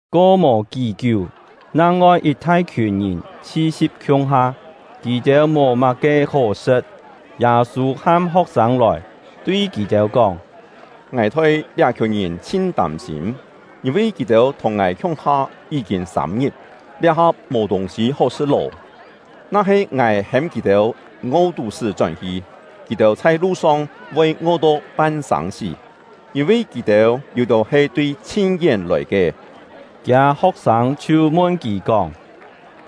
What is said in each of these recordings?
Ko mò kí-kiú, nang-ngoi yit thai-khiùn ngìn chhi-si̍p khiung-ha. Kì-têu mò má-ke hó sṳ̍t; Yâ-sû ham ho̍k-sâng lòi, tui kì-têu kóng: “Ngài thoi liá-khiùn ngìn chhin tâm-sîm, yîn-vi kì-têu thùng ngài khiung-ha yí-kîn sâm-ngit, liá-ha mò tûng-sî hó sṳ̍t lô. Na-he ngài hêm kì-têu ngo-tú-sṳ́ chón-hi, kì-têu chhai lu-song voi ngo-to pan-sâng-sí, yîn-vi kì-têu yû-têu he tui chhin-yén lòi ke.” Kiâ ho̍k-sâng chhiu mun kì kóng: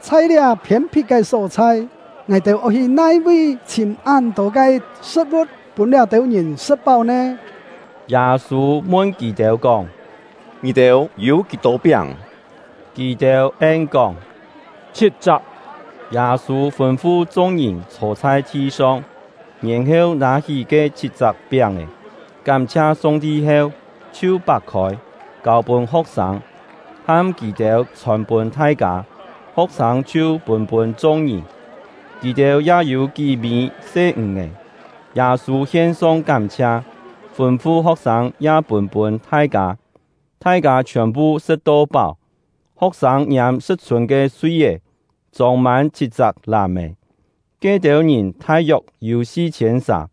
“Chhai liá phiên-phit ke só-chhai, ngài-têu oi hi nai-vi chhìm án-tô ke sṳ̍t-vu̍t pûn liá-têu ngìn sṳ̍t-páu nè?” Yâ-sû mun kì-têu kóng: “Ngì-têu yû kí-tô piáng?” Kì-têu en-kóng: “Chhit-chak.” Yâ-sû fûn-fu chung-ngìn chhô chhai thi-song, yèn-heu nâ-hí ke chhit-chak piáng-è, kám-chhia Song-ti heu, chhiu pak-khôi, kâu-pûn ho̍k-sâng, ham kì-têu chhòn-pûn thai-kâ; ho̍k-sâng chhiu pûn-pûn chung-ngìn. Kì-têu ya yû kí-mî se ǹg-è; Yâ-sû hien-song kám-chhia, fûn-fu ho̍k-sâng ya pûn-pûn thai-kâ. Thai-kâ chhiòn-phu sṳ̍t-to páu. Ho̍k-sâng ngiâm sṳ̍t-chhûn ke sui-é, chông-mân chhit-chak làm-è. Ke-têu ngìn thai-yok yû si-chhiên sà.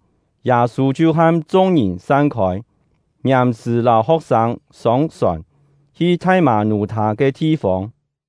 Yâ-sû chhiu ham chung-ngìn san-khôi, ngiàm-sṳ̀ lâu ho̍k-sâng sông-sòn, hi Thai-mâ-nú-thâ ke thi-fông.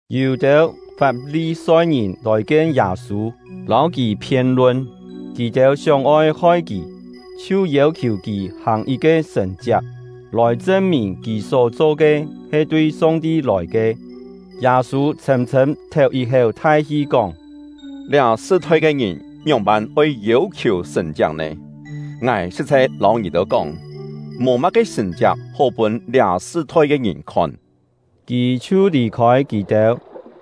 Yû-têu Fap-li-soi-ngìn lòi kien Yâ-sû, lâu kì phien-lun. Kì-têu sióng-oi hoi kì, chhiu yêu-khiù kì hàng yit-ke sṳ̀n-chiak, lòi chṳn-mìn kì só-cho ke he tui Song-ti lòi ke. Yâ-sû chhṳ̂m-chhṳ̂m théu yit-héu thai-hi kóng: “Liá sṳ-thoi ke ngìn ngióng-pân oi yêu-khiù sṳ̀n-chiak nè? Ngài sṳ̍t-chhai lâu ngì-têu kóng, mò má-ke sṳ̀n-chiak hó pûn liá sṳ-thoi ke ngìn khon!” Kì chhiu lì-khôi kì-têu,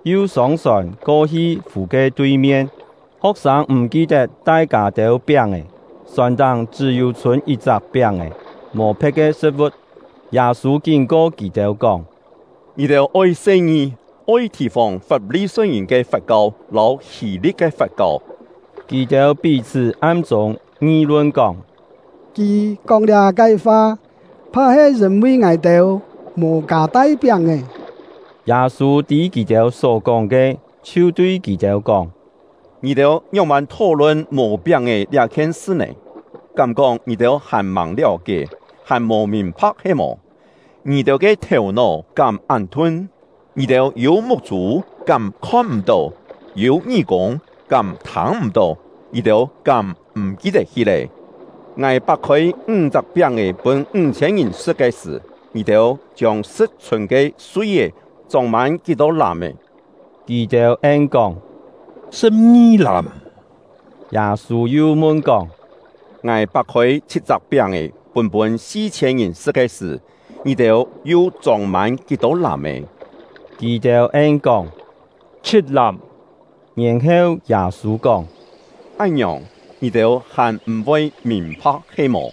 yu sông-sòn ko-hi fù ke tui-mien. Ho̍k-sâng m̀ ki-tet tai kâ-têu piáng-è, sòn-táng chṳ́-yû chhûn yit-chak piáng-è, mò phe̍t ke sṳ̍t-vu̍t. Yâ-sû kín-ko kì-têu kóng: “Ngì-têu oi se-ngi, oi thì-fòng Fap-li-soi-ngìn ke fat-kau lâu Hî-li̍t ke fat-kau.” Kì-têu pí-chhṳ́ am-chûng ngi-lun kóng: “Kì kóng liá-ke fa, pha-he yîn-vi ngài-têu mò kâ-tai piáng-è.” Yâ-sû tî kì-têu só-kóng ke, chhiu tui kì-têu kóng: “Ngì-têu ngióng-pân thó-lun mò piáng-è liá-khien sṳ nè? Kám-kóng ngì-têu hàn-màng liáu-kié, hàn mò mìn-pha̍k he-mò? Ngì-têu ke thèu-nó kám án thun? Ngì-têu yû muk-chû, kám khon-m̀-tó? Yû ngí-kûng, kám thâng-m̀-tó? Ngì-têu kám m̀ ki-tet-hi lé? Ngài pak-khôi ńg-chak piáng-è pûn-pûn ńg-chhiên ngìn sṳ̍t ke sṳ̀, ngì-têu chiông sṳ̍t-chhûn ke sui-é chông-mân kí-tô làm-è?” Kì-têu en-kóng: “Sṳ̍p-ngi làm.” Yâ-sû yu mun-kóng: “Ngài pak-khôi chhit-chak piáng-è pûn-pûn si-chhiên ngìn sṳ̍t ke sṳ̀, ngì-têu yu chông-mân kí-tô làm-è?” Kì-têu en-kóng: “Chhit làm.” Yèn-heu, Yâ-sû kóng: “Án-ngiòng, ngì-têu hàn m̀-voi mìn-pha̍k he-mò?”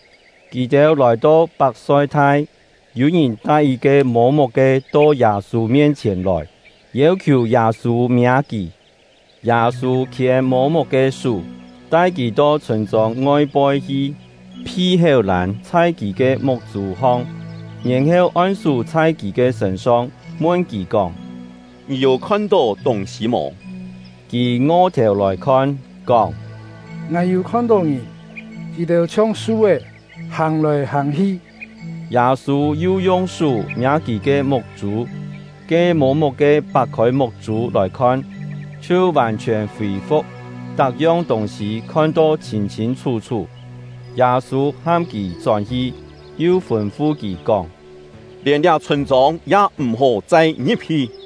Kì-têu lòi-to Pak-soi-thai, yû-ngìn tai yit-ke mô-muk-ke to Yâ-sû mien-chhièn lòi, yêu-khiù Yâ-sû miâ kì. Yâ-sû khiên mô-muk ke sú, tai kì to chhûn-chông ngoi-poi hi, phi héu-lân chhai kì ke muk-chû hong, yèn-heu on-sú chhai kì ke sṳ̂n-song, mun kì kóng: “Ngì yû khon-tó tûng-sî mò?” Kì ngo-thèu lòi khon, kóng: “Ngài yû khon-tó ngìn; kì-têu chhiong su-é, hàng-lòi hàng-hi.” Yâ-sû yu yung sú miâ kì ke muk-chû. Ke mô-muk-ke pak-khôi muk-chû lòi khon, chhiu vàn-chhiòn fî-fu̍k, tak-yong tûng-sî khon-to chhîn-chhîn chhú-chhú. Yâ-sû ham kì chón-hi, yu fûn-fu kì kóng: “Lièn liá chhûn-chông ya m̀-hó chai ngi̍p-hi.”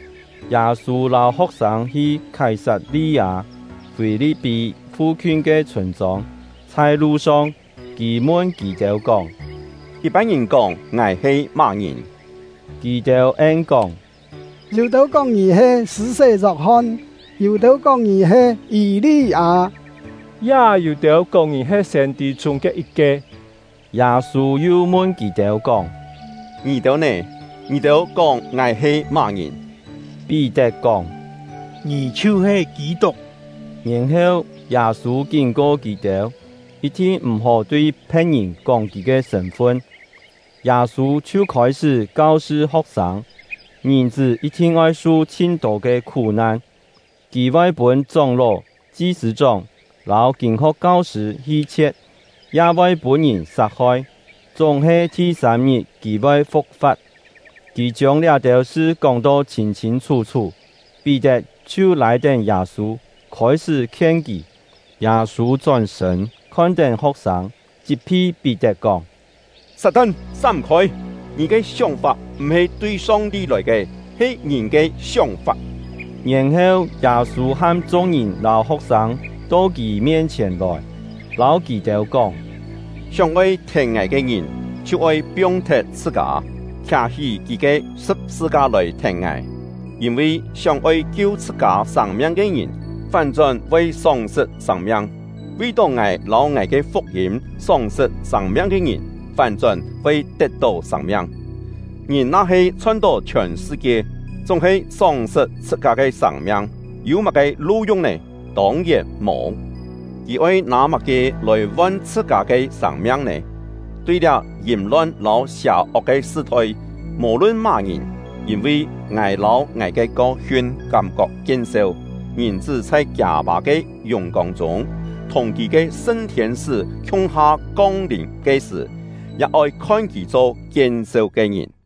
Yâ-sû lâu ho̍k-sâng hi Khái-sat-li-â-Fî-li̍p-pí fu-khiun ke chhûn-chông. Chhai lu-song, kì mun kì-têu kóng: “Yit-pân ngìn kóng ngài he má-ngìn?” Kì-têu en-kóng: “Yû-têu kóng ngì he Sṳ̂-sé Yok-hon; yû-têu kóng ngì he Yî-li-â; ya yû-têu kóng ngì he siên-tî chûng ke yit-ke.” Yâ-sû yu mun kì-têu kóng: “Ngì-têu nè? Ngì-têu kóng ngài he má-ngìn?” Pí-tet kóng: “Ngì chhiu-he Kî-tuk.” Yèn-heu, Yâ-sû kín-ko kì-têu, yit-thin m̀-hó tui phe̍t-ngìn kóng kì ke sṳ̂n-fun. Yâ-sû chhiu khôi-sṳ́ kau-sṳ ho̍k-sâng, Ngìn-chṳ́ yit-thin oi su chhin-tô ke khú-nan; kì voi pûn chóng-ló, chi-sṳ̂-chóng lâu kîn-ho̍k kau-sṳ̂ hi-chhie̍t, ya voi pûn-ngìn sat-hoi, chúng-he thi-sâm-ngit kì voi fu̍k-fa̍t. Kì chiông liá-têu sṳ kóng-to chhîn-chhîn chhú-chhú. Pí-tet chhiu lâi-tén Yâ-sû, khôi-sṳ́ khien kì. Yâ-sû chón-sṳ̂n, khon-tén ho̍k-sâng, chit-phi Pí-tet kóng: “Sat-tan, sám-khôi! Ngì ke sióng-fap m̀-he tui Song-ti lòi ke, he ngìn ke sióng-fap.” Yèn-heu, Yâ-sû ham chung-ngìn lâu ho̍k-sâng to kì mien-chhièn lòi, lâu kì-têu kóng: “Sióng-oi thèn ngài ke ngìn, chhiu oi piong-thet chhṳ-kâ, khià-hí kì ke sṳ̍p-sṳ-ka lòi thèn ngài. Yîn-vi sióng-oi kiu chhṳ-kâ sâng-miang ke ngìn, fán-chón voi sóng-sṳt sâng-miang; vi-tó ngài lâu ngài ke fuk-yîm sóng-sṳt sâng-miang ke ngìn, fán-chón voi tet-tó sâng-miang. Ngìn na-he chhon-tó chhiòn sṳ-kie, chúng-he sóng-sṳt chhṳ-kâ ke sâng-miang, yû má-ke lu-yung nè? Tông-yèn mò! Kì oi nâ má-ke lòi von chhṳ-kâ ke sâng-miang nè? Tui liá yìm-lon lâu sià-ok ke sṳ-thoi, mò-lun má-ngìn, yîn-vi ngài lâu ngài ke kau-hiun kám-kok kien-seu, Ngìn-chṳ́ chhai kiâ Pâ ke yùng-kông chûng, thùng kì ke sṳn thiên-sṳ́ khiung-ha kong-lìm ke-sṳ̀, ya oi khon kì cho kien-seu ke ngìn.”